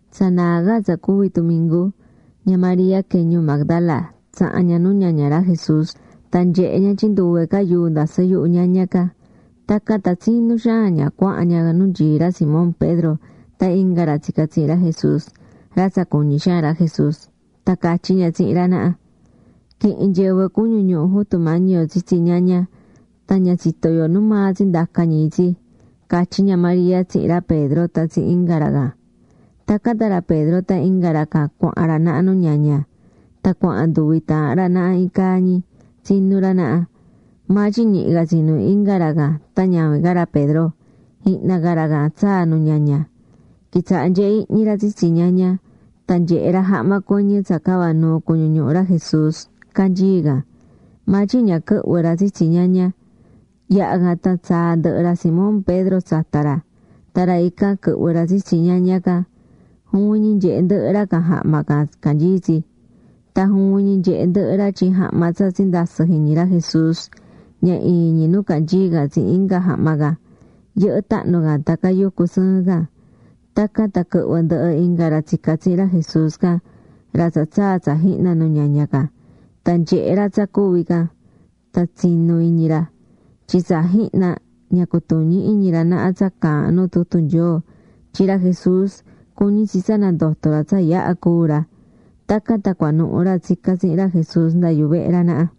Tsa naa ca tsa cuvi̱ tumingu, ña María quee̱ ñuu Magdala tsaha̱n ña nu ñaña ra Jesús. Tan nyehe̱ ña tyin nduve ca yuu ndasɨ́ yuhu ñaña can. Tacan tan tsinú xaan ña cuahán ña nu nyií ra Simón Pedro tan inga ra tsica̱ tsihin ra Jesús, ra tsa cuñí xaan ra Jesús. Tan catyí ña tsihin ra naha: ―Quihi̱n nyɨvɨ cuñu ñuhu Jutu Mañi yo tsitsi ñaña, tan ña tsitó yo nu maa tsindaca̱ ñi itsi ―catyí ña María tsihin ra Pedro tan tsihin inga ra can. Tacan tan ra Pedro tan inga ra can cuahán ra naha nu ñaña. Tan cuahán nduvi taahan ra naha iin caa ñi, tsinú ra naha. Maa tyin ñihi ca tsinú inga ra can tan ñavin ca ra Pedro, jihna ca ra can tsaa̱ nu ñaña. Quitsaha̱ nyehé ihñi ra tsitsi ñaña, tan nyehe̱ ra jahma cuɨñɨ tsa cava̱ nuu cuñu ñuhu ra Jesús, canyií can. Maa tyin ña quɨhvɨ̱ ra tsitsi ñaña. Yaha̱ can tan tsaa̱ ndɨhɨ ra Simón Pedro tsata ra, tan ra ican quɨhvɨ̱ ra tsitsi ñaña can. Juvin ñi nyehe̱ ndɨhɨ ra can jahma can canyií tsi. Tan juvin ñi nyehe̱ ndɨhɨ ra tyin jahma tsa tsindasɨ̱ jiñi ra Jesús, ña iin ñi nu canyií can tsihin inga jahma can, yɨhɨ́ tahnu can tan cayucú sɨɨn can. Tacan tan quɨhvɨ̱ ndɨhɨ inga ra tsica̱ tsihin ra Jesús can, ra tsa tsaa̱ tsa jihna nu ñaña can. Tan nyehe̱ ra tsa cuvi̱ can, tan tsinu̱ iñi ra. Tyin tsa jihna, ña cutuñí iñi ra naha tsa caahán nu tutu Nyoo, tyin ra Jesús cuñí tsi tsa nandoto ra tsa yaha cúu ra. Tacan tan cuanuhu ra tsica̱ tsihin ra Jesús nda yuvehe ra naha.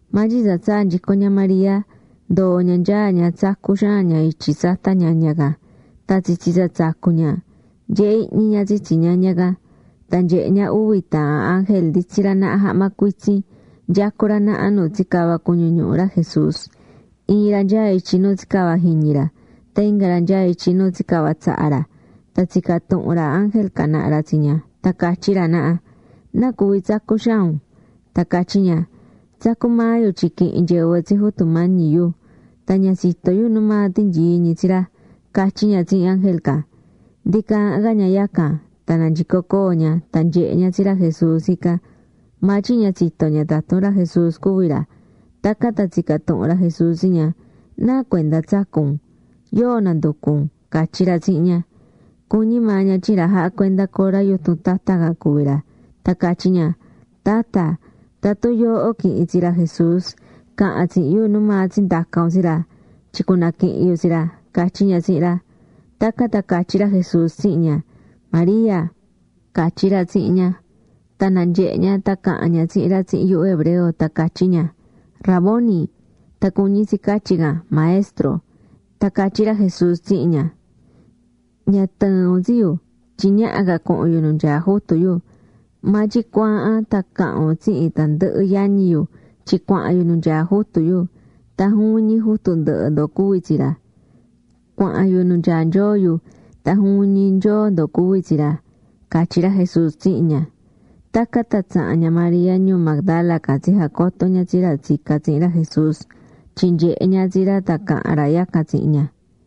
Maa tyin tsa tsaa̱ nyico ña María, ndoo̱ ña nyaá ña tsacú xaan ña ityi tsata ñaña can. Tan tsitsi tsa tsacú ña, nyehé ihñi ña tsitsi ñaña can. Tan nyehe̱ ña uvi taahan ángel nditsí ra naha jahma cuitsin, nyecú ra naha nu tsicava̱ cuñu ñuhu ra Jesús. Iin ra nyaá ityi nu tsicava̱ jiñi ra, tan inga ra nyaá ityi nu tsicava̱ tsaha ra. Tan tsica̱ tuhun ra ángel can naha ra tsi ña tan catyí ra naha: ―¿Nacuvi tsacú xaan un? Tan catyí ña: ―Tsacú maa yu tyin quihi̱n nyɨvɨ tsi Jutu Mañi yu, tan ña tsitó yu nu maa tinyií ñi tsi ra ―catyí ña tsihin ángel can. Ndi caahán ca ña yacan, tan nanyico coo ña tan nyehe̱ ña tsi ra Jesús ican. Maa tyin ña tsitó ña tatun ra Jesús cuví ra. Tacan tan tsica̱ tuhun ra Jesús tsi ña: ―¿Nacuenda tsacú un? ¿Yóo nanducú un? ―catyí ra tsihin ña. Cuñí maa ña tyin ra jahá cuenda cora yutun tata can cuví ra. Tan catyí ña: ―Tatta, tatun yooho quihi̱n tsi ra Jesús, ca̱han tsihin yu nu maa tsindaca̱ un tsi ra, tyin cunaquihin yu tsi ra ―catyí ña tsihin ra. Tacan tan catyí ra Jesús tsihin ña: ―¡María! ―catyí ra tsihin ña. Tan nanyehe̱ ña tan caha̱n ña tsihin ra tsihin yuhu hebreo, tan catyí ña: ―¡Raboni! ―Tan cuñí tsi catyí can: “Maestro”. Tan catyí ra Jesús tsihin ña: ―Ña tɨ̱ɨn un tsi yu, tyin ñaha ca cuhun yu nu nyaá Jutu yu. Maa tyin cu̱aahan tan ca̱han un tsihin tandɨhɨ yañi yu tyin cuahan yu nu nyaá Jutu yu, tan juvin ñi Jutu ndɨhɨ ndo cuví tsi ra. Cuahan yu nu nyaá Nyoo yu, tan juvin ñi Nyoo ndo cuví tsi ra ―catyí ra Jesús tsihin ña. Tacan tan tsaha̱n ña María ñuu Magdala can tsijacoto̱ ña tsi ra tsica̱ tsihin ra Jesús tyin nyehe̱ ña tsi ra tan caha̱n ra yacan tsihin ña.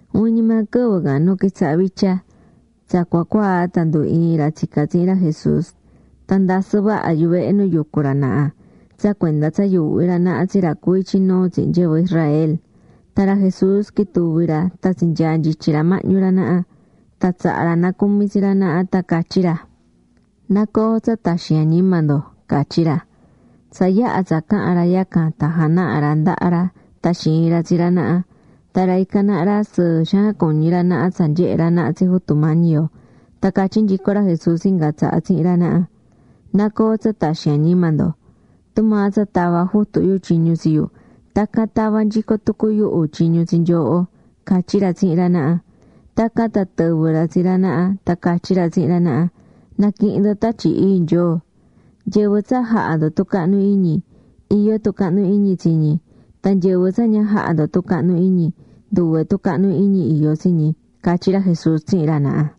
Juvin ñi maa quɨvɨ can nu quitsaha vitya, tsa cua cuaa tan ndu ii̱n ra tsica̱ tsihin ra Jesús. Tan ndasɨ vaha yuvehe nu yucú ra naha tsa cuenda tsa yuuhví ra naha tsi ra cuví ityi nuu tsihin nyɨvɨ Israel. Tan ra Jesús quituvi̱ ra tan tsinyaa̱ nyityi ra mahñu ra naha. Tan tsaha̱ ra nacumi tsi ra naha, tan catyí ra: ―Na coo tsa taxin añima ndo ―catyí ra. Tsa yaha̱ tsa caha̱n ra yacan tan janaha̱ ra ndaha ra tan xiin ra tsi ra naha. Tan ra ican naha ra sɨɨ xaan cuñí ra naha tsa nyehe̱ ra naha tsi Jutu Mañi yo. Tan catyí nyico ra Jesús inga tsaha tsihin ra naha: ―Na coo tsa taxin añima ndo. Tumaa tsa tava̱ Jutu yu tyiñu tsi yu, tacan tavá nyico tucu yuhu tyiñu tsi nyooho ―catyí ra tsihin ra naha. Tacan tan tɨvɨ̱ ra tsi ra naha tan catyí ra tsihin ra naha: ―Na̱quihin ndo Tatyi Ii Nyoo. Nyɨvɨ tsa jahá ndo tucahnu iñi, iyó tucahnu iñi tsi ñi. Tan nyɨvɨ tsa ña jahá ndo tucahnu iñi, nduve tucahnu iñi iyó tsi ñi ―catyí ra Jesús tsihin ra naha.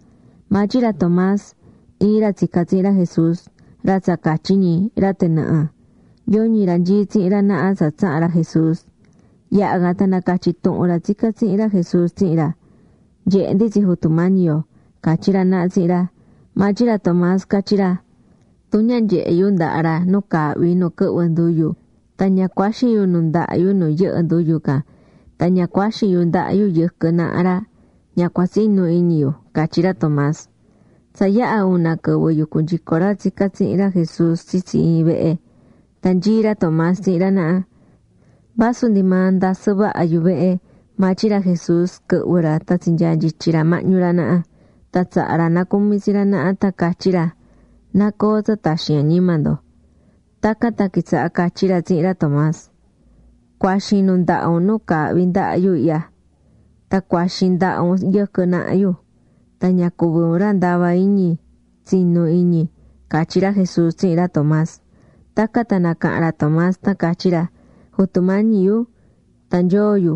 Maa tyin ra Tomás, iin rq tsica̱ tsihin ra Jesús, ra tsa catyí ñi: “ra tɨnɨhɨ”, yoñi ra nyií tsihin ra naha tsa tsaha̱n ra Jesús. Yaha̱ can tan nacatyi̱ tuhun ra tsica̱ tsihin ra Jesús tsihin ra: ―Nyehe̱ ndi tsi Jutu Mañi yo ―catyí ra naha tsihin ra. Maa tyin ra Tomás catyí ra: ―Tun ña nyehe yu ndaha ra nu caahví nu quɨhvɨ nduyu, tan ña cuaxin yu nundaha yu nu yɨhɨ̱ nduyu can, tan ña cuaxin yu ndaha yu yɨquɨ naha ra, ña cua tsinu iñi yu ―catyí ra Tomás. Tsa yaha̱ una quɨvɨ yucú nyico ra tsica̱ tsihin ra Jesús tsitsi iin vehe. Tan nyií ra Tomás tsihin ra naha. Tacan tan vasu ndi maa ndasɨ vaha yuvehe, maa tyin ra Jesús quɨhvɨ̱ ra tan tsinyaa̱ nyityi ra mahñu ra naha. Tan tsaha̱ ra nacumi tsi ra naha tan catyí ra: ―Na coo tsa taxin añima ndo. Tacan tan quitsaha̱ catyí ra tsihin ra Tomás: ―Cu̱axin nundaha un nu caahví ndaha yu ihya. Tan cu̱axin ndaha un yɨquɨ naha yu. Tan ña cuvi un ra ndava iñi. Tsi̱nu iñi ―catyí ra Jesús tsihin ra Tomás. Tacan tan nacaha̱n ra Tomás tan catyí ra: ―¡Jutu Mañi yu! ¡Tan Nyoo yu!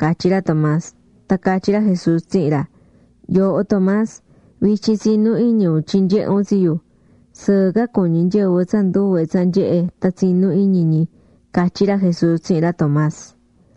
―catyí ra Tomás. Tan catyí ra Jesús tsihin ra: ―Yooho Tomás, vityin tsinú iñi un tyin nyehé un tsi yu. Sɨɨ ca cuñí nyɨvɨ tsa nduve tsa nyehe̱ tan tsinú iñi ñi ―catyí ra Jesús tsihin ra Tomás.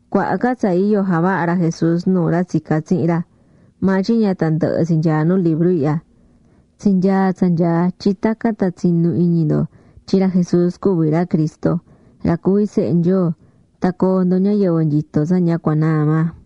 Cuaha ca tsa iyo javaha̱ ra Jesús nuu ra tsica̱ tsihin ra, maa tyin ña tandɨhɨ tsi nyaá nu libru ihya. Tsinyaa̱ tsa nyaá tyin tacan tan tsinu iñi ndo tyin ra Jesús cuví ra Cristo, ra cuví Sehe Nyoo, tan coo ndo ñayɨvɨ nyitó tsa ña cua naa maa.